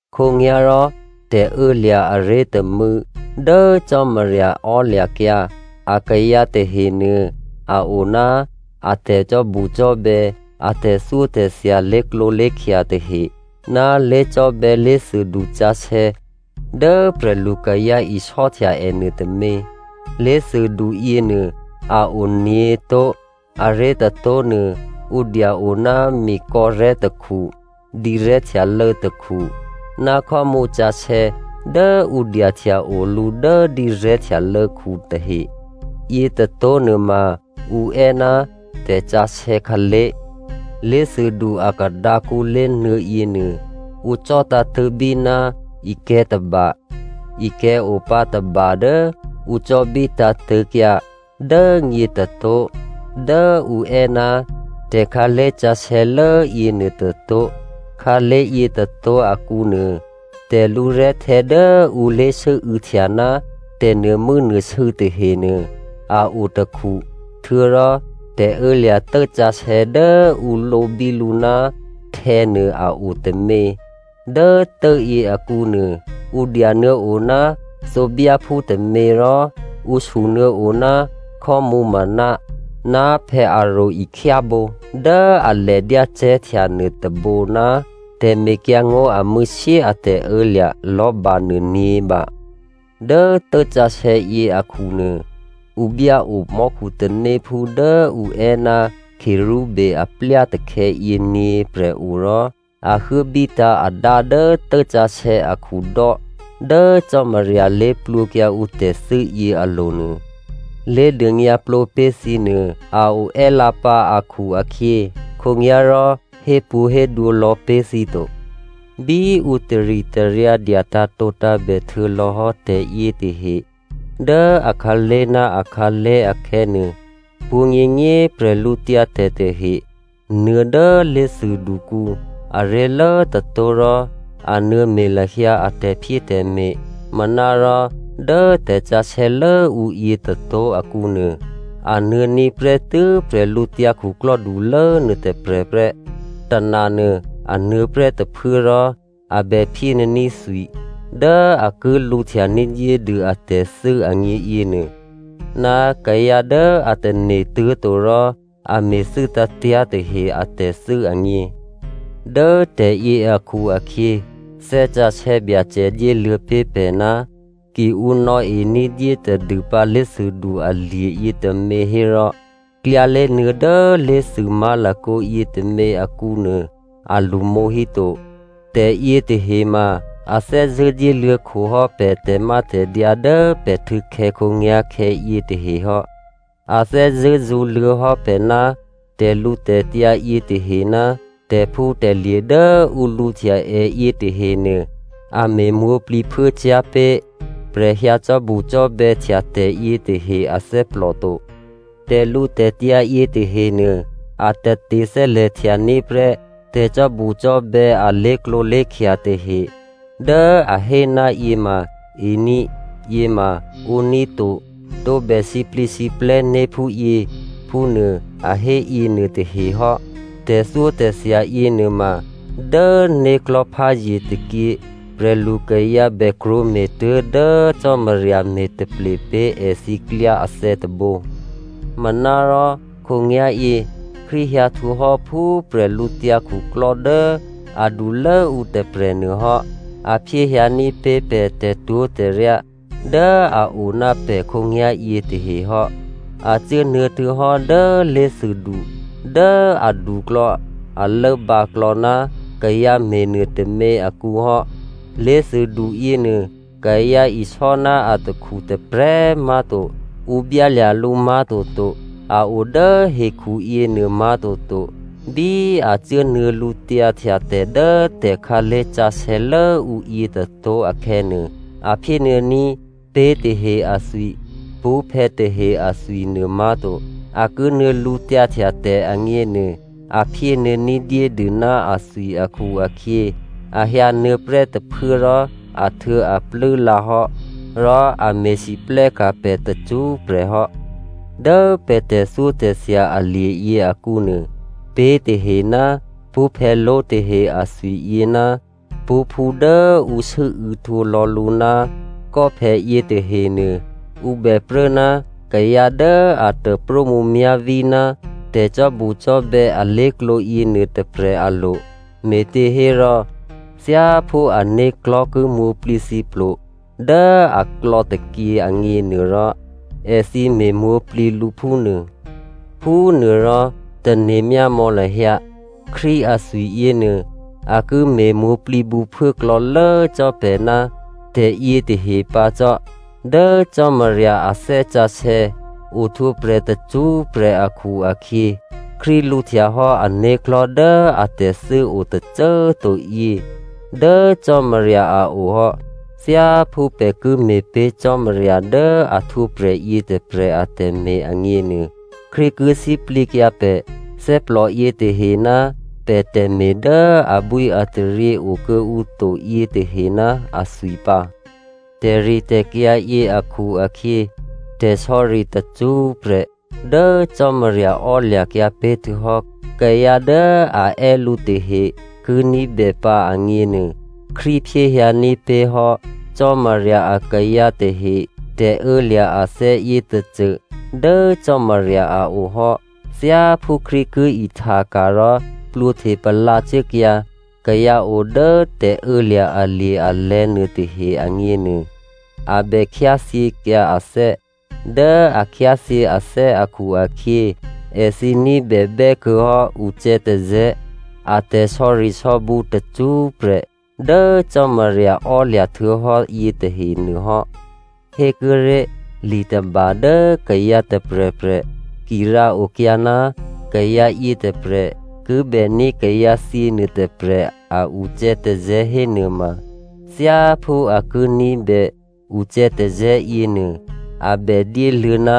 Khǒnyá̤rò tè̤ô̌lya̤ aré̤ tômû̌ dố Cò́marya ò́lya̤kyǎ akayǎ tahenuô, a o ná a tè̤cò́bucò́bè̌ a tè̤thyótè̤thya lé̤klǒlé̤khya tahe ná lé̤cò́bè̌ lé̤thûdu sǎsè̌ dố prè̤lu kayǎ isò́htya ènuô tômě Lé̤thûdu yěnuô a o nyě̤tó̤. Aré̤ tôtó̤nuô ǔ dya-o ná mikò̌rè̤́ tôkhu, dǐrè̤́ htyalô̌ tôkhu ná khò́mǔ sǎsè̌ dố ǔ dyahtya o lǔ dố dǐrè̤́ htyalô̌khu tahe. Yětôtó̤ nuôma ǔ è́ ná tè̤sǎsè̌ khǎlé̤. Lé̤thûdu a kadǎkǔ lé̤nuô̌ yěnuô ǔ cò̌ tǎ̤tṳ̂̌bí ná ikè̤̌ tôba. Ikè̤̌ opǎ tôba dố ǔ cò̌bí tǎ̤tṳ̂̌kyǎ dố nyě tôtó̤ dố ǔ è́ ná tè̤khǎlé̤ sǎsè̌lố yěnuô tôtó̤. Khǎlé̤ yětôtó̤ akǔnuô, tè̤lǔrè̤́htè̌ dố ǔ lé̤sû́û̌htya ná tè̤nuô̤mû́nuô̤sû̌ tahenuô a o tôkhu, htuô̌rò tè̤ô̌lya̤ tốsǎsè̌ dố ǔ lǒbí lǔ ná htè̌ nuô a o tômě. Dố tốyě akǔnuô, ǔ dyanuô̌o ná thǒbyáphú tômě rò ǔ sunuô̌o ná khò́mǔmǎna, ná Aròn ihtyábǒ dố alè dyácè̤́htya nuôtôbǒ, ná tè̤mekyǎngó̤ amû̌shyé a tè̤ô̌lya̤ lò̤́ba nuô nyě̤ba. Dố tốsǎsè̌yě akhunuô, ǔ byáo mò́khu tanéphú dố ǔ è́ ná cherubim aplya takhè̌yě nyě̤prè̤ o rò a huốbítǎ̤ adá dố tốsǎsè̌ akhudò́ dố Cò́marya lé̤plwǒkyǎ ǔ tè̤thû́ yě alo̤nuô. Lé̤dônyǎplǒ pé̤ thǐ nuô a o è́꤮ lǎpǎ akhu-akhyě, khǒnyá̤rò hépwǒ̤hédwǒ lò̌ pé̤ thǐ to. Bí ǔ taritaryǎ dya tǎ̤tǒtǎ̤bè htuô̌lò̌hò́ tè̤yětahe dố akhǎlé̤ ná akhǎlé̤ akhè̌nuô, pwǒ̤nyěnyě꤮ bwídu tahe nuô̌ dố lé̤thûdukǔ aré̤lố tôtó̤ rò a nuô̌me̤ lahyǎ a tè̤phyétè̤me̤. Manárò dố tè̤sǎsè̌ lốǔyě tôtó̤ akǔnuô, a nuô̌ní̤ prè́tû́ bwídukhulố nuôtôprè̤ prè́. Tônanuô a nuô̌prè́ tôphuố rò a bè phyénuô̌ní̤ thwi dố a ki lǔhtya ní̤dyédû atè̤thû́ agně yěnuô, ná kayǎ dố a tane̤ tuố̤to rò a me̤thû́ tǎ̤tyá̤ tahe atè̤thû́ agně. Dố tè̤yě akhu-akhyě Thè́ Sǎsè̌ Byacè dyéluô̌ pé̤ pè̤, ki ǔ nò̌e ní̤dyé tadûpǎ lé̤thûdu alye̤ yětômě hérò klyálé̤nuô̌ dố lé̤thû má̤lakǒ yětômě akǔnuô, a lṳmǒ híto. Tè̤yětahe ma a thè́zṳ̂́ dyéluô̌khohò́ pè̤ tè̤mátè̤dyǎ dố pè̤ htû̌khè̌ khǒnyá̤khè̌ yětahe hò́. A thè́zṳ̂́ zṳ̌luô̌hò́ pè̤ ná tè̤lǔtè̤tyǎ yětahe ná tè̤phútè̤lye̤ dố ǔ lǔhtya è yětahenuô, a me̤ mwǒ̤plǐphuốcyá̤ pé̤ prè̤ hyǎ cò́bucò́bè̌htya tè̤yě tahe athè́plò to. Tè̤lǔtè̤tyǎ yětahenuô, a tate thè́lè̤htyaní̤ prè́ tè̤cò́bucò́bè̌ a lé̤klǒlé̤khya tahe dố a hé ná yěma ení̤, yěma ǒní̤ to, tǒbè sǐplǐsǐplè̤́ né̤ phúyě phúnuô, a hé yěnuôtahe hò́. Tè̤thyótè̤thya yěnuôma dố né̤klò̤́ pházye tôkyě, prè̤lukayǎ bè krwǒme̤ tuố̤dố Cò́marya me̤taple pé̤ èthǐ klyá athè̌ tôbǒ. Manárò khǒnyá̤yě Krístu hyǎ htwǒhò́ phú prè̤lǔtyǎ khuklò́ dố adulố ǔ tôprè̤ nuôhò́. A phyéhyǎní̤ pé̤ pè̤ tè̤twó̤tè̤ryá dố a o ná pè̤ khǒnyá̤yě tahe hò́. A cuốnuô̌ htuô̌hò́ dố lé̤thûdu dố aduklò̌, a lốbǎklò̌ ná kayǎ me̤nuô tômě akǔhò́. Lé̤thûdu yěnuô, kayǎ isò́ ná atakhu tôprè̤꤮ má̤to, ǔ byálya̤ lǔ má̤toto, a o dố hekhu yěnuô má̤toto. Bí a cuốnuô̌ lǔtyǎhtyatè̤ dố tè̤khǎlé̤ sǎsè̌ lốǔ yětôtó̤ akhè̌nuô, a phyénuô̌ní̤ pé̤ tahe athwi, pṳ́phè̌ tahe athwi nuômá̤to. A ki nuô̌ lǔtyǎhtyatè̤ agněnuô, a phyénuô̌ ní̤dyédû ná athwi akhu-akhyě, a hyǎnuô̌ prè́ tôphuố rò ahtuô̌aplû́ lǎhò́, rò a me̤lwóhteka̤ pè̤ tacṳ́prè̤ hò́. Dố pè̤ tè̤thyótè̤thya alye̤yě akǔnuô, pé̤ tahe ná pṳ́phè̌ló̤ tahe athwi yě ná pṳ́phú dố ǔ sû́û̌ htwǒlò̌ lǔ ná kò́phè yětahenuô, ǔ bè pruố ná kayǎ dố a taprómǔmyá̤ví ná tè̤cò́bucò́bè̌ alé̤klǒ yěnuô tôprè̤ alo̤, me̤těhérò thyáphú ané̤klò̤́ ki mwǒ̤plǐthǐplo dố aklò̌ tôkyě agněnuôrò, èthǐ me̤mwǒ̤plǐ lǔ phúnuô. Phúnuôrò, tane̤ myámò̌ lahyǎ Krístu athwi yěnuô, a ki me̤ mwǒ̤plǐ bǔphuốklò̌lố cò́ pè̤ ná tè̤yětahe pǎ cò́. Dố Cò́marya a Thè́ Sǎsè̌ ohtwǒprè̤ tacṳ́prè̤ akhu-akhyě, Krístu lǔhtyahò́ ané̤klò̤́ dố atè̤thû́ o tôcô꤮ to yě dố Cò́marya a o hò́. Thyáphú pè̤ ki me̤pé̤ Cò́marya dố a htwǒprè̤ yětôprè̤ atè̤me̤ agněnuô, Krístu ki sǐplǐkyǎ pè̤ thè́plò yětahe ná pè̤ tè̤me̤ dố abwíataryě okuô̌ǔ to yětahe ná athwi pǎ. Dố tè̤ritè̤kyǎ yě akhu-akhyě, tè̤sò̌ri tacṳ́prè̤ dố Cò́marya ò́lya̤kyǎ pé̤ htuô̌hò́ kayǎ dố a è́ lǔ tahe ki ní̤bèpǎ agněnuô, Krístu phyéhyǎní̤ pé̤ hò́ Cò́marya akayǎ tahe tè̤ô̌lya̤ athè̌ yětôcô dố Cò́marya a o hò́. Thyáphú Krístu ki ihtaka̤ rò plwǒhte palǎ cuốkyǎ kayǎ o dố tè̤ô̌lya̤ alye̤ alè̤̌ nuôtahe agněnuô, a bè khyáthyěkyǎ athè́. Dố a khyáthyě athè́ akhu-akhyě, èthǐ ní̤bè bè́kuô̌hò́ ucè̌tazè̌, a tè̤sò̌risò̌bǔ tacṳ́prè̤ dố Cò́marya ò́lya̤ htuô̌hò́ yětahenuô hò́. Hékuốré̤ li tôba dố kayǎ tôprè̤prè̤ ki rǎokyǎ ná kayǎ yětôprè̤ ki bèní̤ kayǎthyě nuôtôprè̤ a ucè̌tazè̌ hénuôma, thyáphú a ki ní̤bè ucè̌tazè̌ yěnuô, a bè dyéluô̌ ná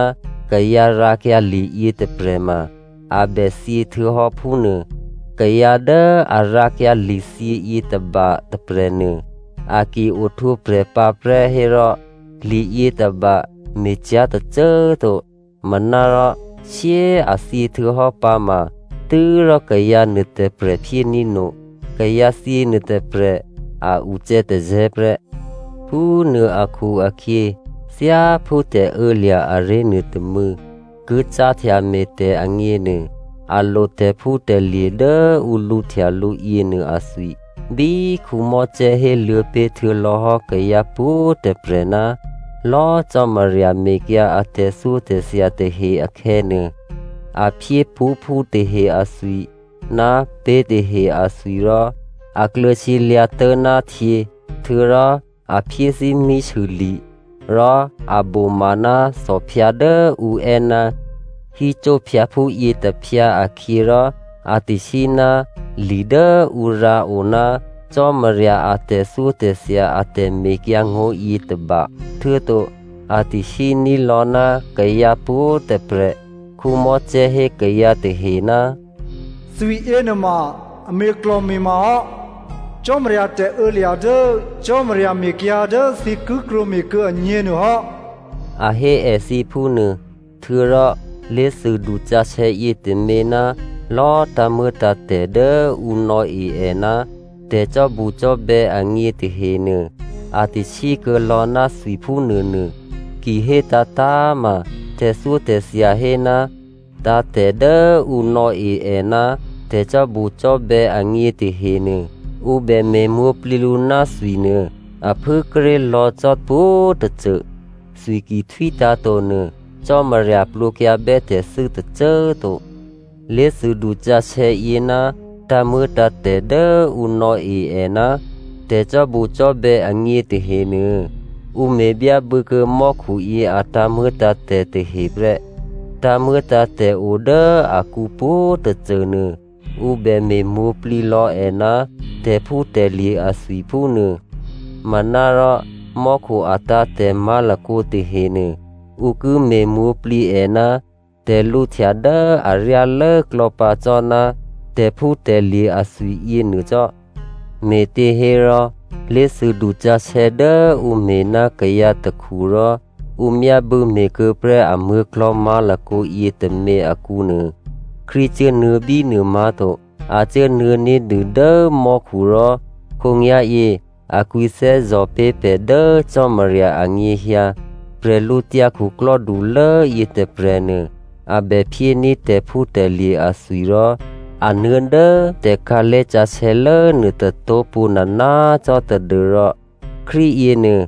kayǎ rǎkyǎ liyě tôprè̤ ma a bè thyě htuô̌hò́, phúnuô. Kayǎ dố a rǎkyǎ lithyě yětôba tôprè̤nuô, a ki ohtwǒprè̤ pǎprè́ hérò, liyětôba me̤cyá̤ tôcô꤮ to. Manárò shyé꤮ a thyě htuô̌hò́ pǎma tû́rò kayǎ nuôtôprè̤ phyéní̤ no kayǎthyě nuôtôprè̤ a ucè̌tazè̌ prè́. Phúnuô akhu-akhyě, thyáphú tè̤ô̌lya̤ aré̤ nuôtômû̌ ki cáhtya me̤tè̤ agněnuô, a lo tè̤phútè̤lye̤ dố ǔ lǔhtya lǔ yěnuô athwi. Bí Mosè héluô̌ pé̤ htuô̌lò̌hò́ kayǎ pwǒ̤꤮ tôprè̤ ná lò̌꤮ Cò́marya mekyǎ a tè̤thyótè̤thya tahe akhè̌nuô, a phyé pṳ́phú tahe athwi ná pé̤ tahe athwi rò a kluô̌ sǐlyǎ̤tố̤ ná htyě, htuô̌rò a phyé thímísûli̤ rò a boma ná thòphyǎ dố ǔ è́ ná hyssóphyǎphú yětôphyǎ akhyě rò a tasí ná li dố ǔ rǎo ná Cò́marya a tè̤thyótè̤thya a tè̤mekyǎngó̤yě tôba, htuô̌to a tasíní̤ lò̌ ná kayǎ pwǒ̤꤮ tôprè̤. Mosè hé kayǎ tahe, “Thwi yěnuôma a me̤klò̤me̤ma hò́ Cò́marya tè̤ô̌lya̤ dố Cò́marya mekyǎ dố thǐ ki krwǒme̤kuô̌ agně nuôhò́” a hé èthǐ phúnuô. Htuô̌rò lé̤thûdu sǎsè̌ yětômě ná lò̌ tǎ̤muô̌tǎ̤tè̤ dố ǔ nò̌e è ná tè̤cò́bucò́bè̌ agně tahenuô, a tasí kuô̌ lò̌ ná thwi phúnuônuô. Ki hé tǎ̤tǎ̤꤮ ma, tè̤thyótè̤thya hé, tǎ̤tè̤ dố ǔ nò̌e è ná tè̤cò́bucò́bè̌ agně tahenuô, ǔ bè me̤mwǒ̤plǐ lǔ ná thwi nuô a phû kíré̤ lò̌ cò́ pwǒ̤tôcô. Thwi ki htwítǎ̤ to nuô, Cò́marya plwǒkyǎbè́ tè̤thû́ tôcô꤮ to. Lé̤thûdu sǎsè̌yě ná tǎ̤muô̌tǎ̤tè̤ dố ǔ nò̌e è ná tè̤cò́bucò́bè̌ agně tahenuô, ǔ me̤ byábû̌kuô̌ mò́khuyě a tǎ̤muô̌tǎ̤tè̤ tahe prè́. Tǎ̤muô̌tǎ̤tè̤ odố akǔ pwǒ̤꤮ tôcô nuô ǔ bè me̤ mwǒ̤plǐ lò̌ è ná tè̤phútè̤lye̤ athwi phúnuô. Manárò mò́khu atǎ̤tè̤ má̤lakǒ tahenuô, ǔ ki me̤ mwǒ̤plǐ è ná tè̤lǔhtya dố aryálố klò̌pǎ cò́ ná tè̤phútè̤lye̤ athwiyě nuô cò́. Me̤těhérò lé̤thûdu sǎsè̌ dố ǔ me̤ ná kayǎ takhu rò ǔ myábû̌ me̤kuô̌ prè́ amuố̤klò̤́ má̤lakǒ yětômě akǔ nuô, Krístu cuốnuô̌ bínuô má̤to. A cuốnuô̌ ní̤dû dố mò́khu rò khǒnyá̤yě a kwǐthè́zò̤ pé̤ pè̤ dố Cò́marya anyěhyǎ. Bwídukhulố yětôprè̤nuô, a bè phyéní̤ tè̤phútè̤lye̤ athwi rò a nuô̌ dố tè̤khǎlé̤ sǎsè̌lố nuôtôtó̤ pwǒ̤nana꤮ cò́ tadû́rò Krístu yěnuô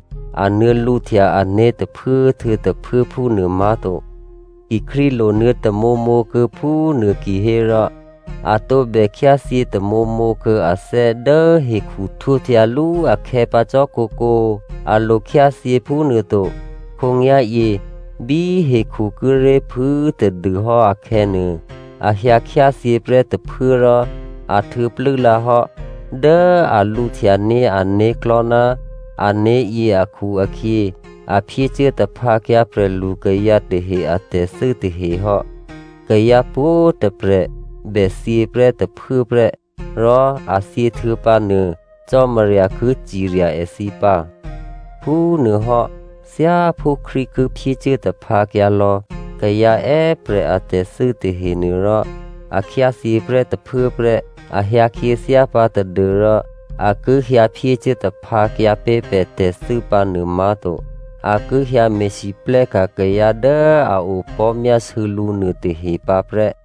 a nuô̌ lǔhtya ané̤ tôphuố htuô̌ tôphuố phúnuô má̤to. Ki Krístu lonuô̌ tamǒmǒ kuô̌ phúnuô kihérò, a tǒbè khyáthyě tamǒmǒ kuô̌ athè́ dố hekhu htwǒhtyalú akhè̌ pǎ cò́ kǒkǒ. A lo khyáthyě phúnuôto. Khǒnyá̤yě bí hekhu kíré̤ phû꤮ tadûhò́ akhè̌nuô, a hyǎ khyáthyě prè́ tôphuố rò a htuô̌plû́ lǎhò́. Dố a lǔhtyaní̤ ané̤klò̤́ ná ané̤yě akhu-akhyě, a phyécuố taphǎkyǎ prè̤lu kayǎ tahe atè̤thû́ tahe hò́. Kayǎ pwǒ̤꤮ tôprè̤ bè thyě prè́ tôphuốprè́. Rò a thyěhtuô̌ pǎnuô, Cò́marya ki cirya èthǐ pǎ. Phúnuôhò́ thyáphú Krístu ki phyécuố taphǎkyǎ lò̌ kayǎ è́prè̤ atè̤thû́ tahenuô rò a khyáthyě prè́ tôphuố prè́. A hyǎ khyěthyá pǎ tadû́rò a ki hyǎ phyécuố taphǎkyǎ pé̤ pè̤ tè̤thû́ pǎnuô má̤to. A ki hyǎ me̤lwóhteka̤ kayǎ dố a opò̤́myásû̌ lǔ nuôtahe pǎ prè́.